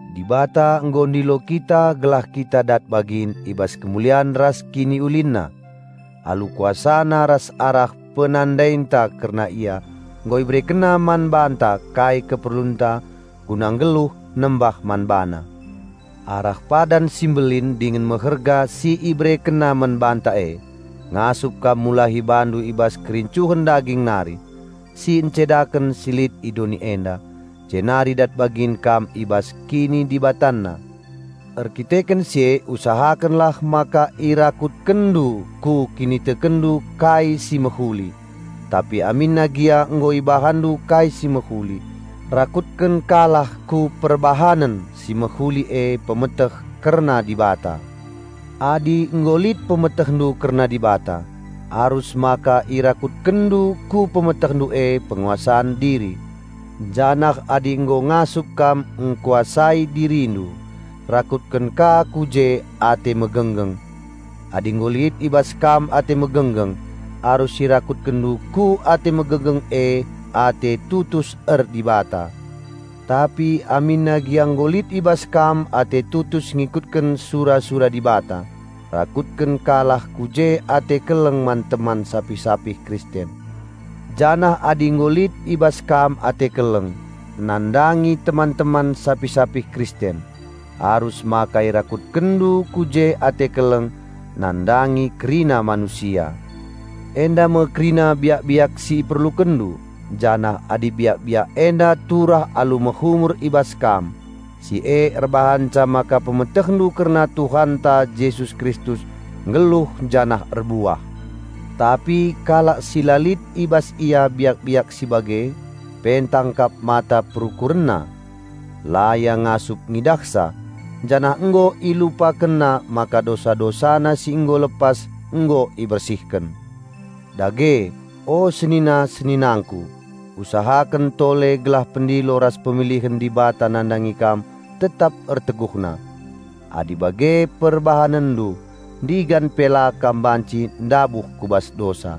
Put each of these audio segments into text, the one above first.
Dibata nggo ndilo kita gelah kita dat bagin i bas kemulian ras KiniulinNa. Alu KuasaNa ras arah penandainta kerna Ia nggo IberekenNa man banta kai keperlunta guna nggeluh nembah man BaNa. Arah padan si mbelin dingen meherga si IberekenNa man banta e, ngasup kam mulahi bandu i bas kerincuhen daging nari, si ncedaken si lit i doni enda, jenari dat bagin kam i bas kinidibatanna. Erkiteken si e usahakenlah maka irakutkenndu ku kinitekenndu kai si mehuli, tapi aminna gia nggo ibahanndu kai si mehuli, rakutken ka lah ku perbahanen si mehuli e pemeteh kerna Dibata. Adi nggo lit pemetehndu kerna Dibata, arus maka irakutkenndu ku pemetehndu e penguasan diri; janah adi nggo ngasup kam ngkuasai dirindu, rakutken ka ku je ate megenggeng. Adi nggo lit i bas kam ate megenggeng, arus irakutkenndu ku ate megenggeng e ate tutus er-Dibata. Tapi aminna gia nggo lit i bas kam ate tutus ngikutken sura-sura Dibata, rakutken ka lah ku je ate keleng man teman sapih-sapih Kristen; janah adi nggo lit i bas kam ate keleng nandangi teman-teman sapih-sapih Kristen, arus maka irakutkenndu ku je ate keleng nandangi kerina manusia. Enda me kerina biak-biak si iperlukenndu, janah adi biak-biak enda turah alu mehumur i bas kam, si e erbahanca maka pemetehndu kerna Tuhanta Jesus Kristus nggeluh janah erbuah. Tapi kalak si la lit i bas ia biak-biak si bage, pentang kap mata perukurenna; la ia ngasup ngidahsa, janah nggo ilupakenna maka dosa-dosana si nggo lepas nggo ibersihken. Dage, o senina-seninangku, usahaken tole gelah pendilo ras pemilihen Dibata nandangi kam tetap erteguhna. Adi bage perbahanndu, ndigan pe la kam banci ndabuh ku bas dosa.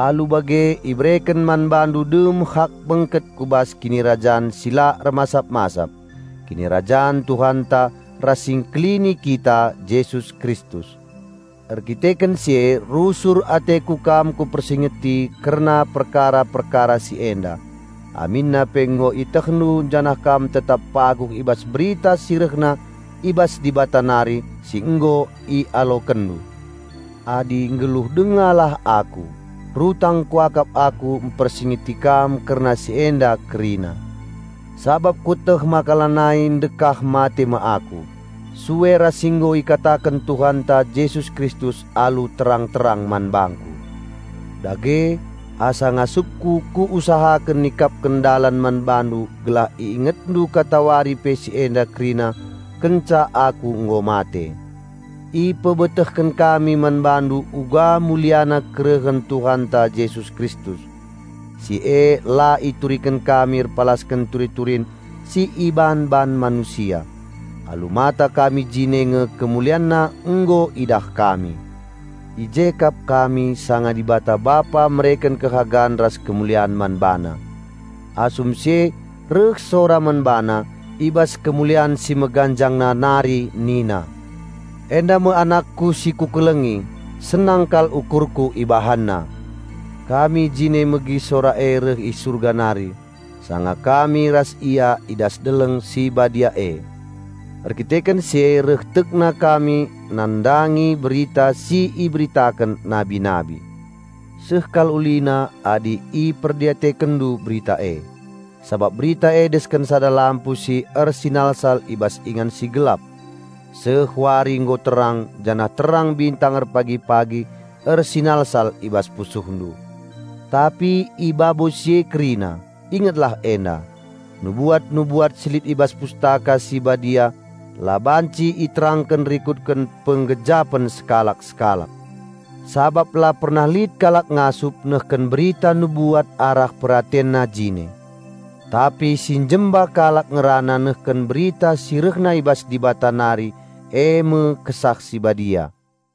Alu bage ibereken man bandu dem hak bengket ku bas Kinirajan si la ermasap-masap, Kinirajan Tuhanta ras Si Engkelini kita Jesus Kristus. Erkiteken si e rusur ateku kam kupersingeti kerna perkara-perkara si enda, aminna pe nggo ietehndu janah kam tetap paguh i bas berita si rehna i bas Dibata nari si nggo ialokenndu. Adi nggeluh dengalah aku, rutang kuakap aku mpersingeti kam kerna si enda kerina. Sabap kueteh maka lanai ndekah mate me aku, sue ras si nggo ikataken Tuhanta Jesus Kristus alu terang-terang man bangku. Dage, asa ngasupku kuusahaken nikapken dalan man bandu gelah iingetndu katawari pe si enda kerina kenca aku nggo mate. Ipebetehken kami man bandu uga muliana kerehen Tuhanta Jesus Kristus. Si e la ituriken kami erpalasken turi-turin si iban-ban manusia. Alu mata kami jine nge KemulianNa nggo idah kami. I je kap kami sanga Dibata Bapa mereken kehagan ras kemulian man BaNa. Asum si e reh sora man BaNa i bas Kemulian si Meganjangna nari nina, "Enda me Anakku si Kukelengi, senang kal ukurKu ibahanna!" Kami jine megi sora e reh i Surga nari, sanga kami ras Ia i das deleng si badia e. Erkiteken si e reh tekna kami nandangi berita si iberitaken nabi-nabi. Seh kal ulina adi iperdiatekenndu berita e, sabap berita e desken sada lampu si ersinalsal i bas ingan si gelap, seh wari nggo terang janah terang bintang erpagi-pagi ersinalsal i bas pusuhndu. Tapi i babo si e kerina, ingetlah enda: nubuat-nubuat si lit i bas Pustaka Si Badia la banci iterangken rikutken penggejapen sekalak-sekalak. Sabap la pernah lit kalak ngasup nehken berita nubuat arah peratenna jine. Tapi si njemba kalak ngerana nehken berita si rehna i bas Dibata nari e me Kesah Si Badia.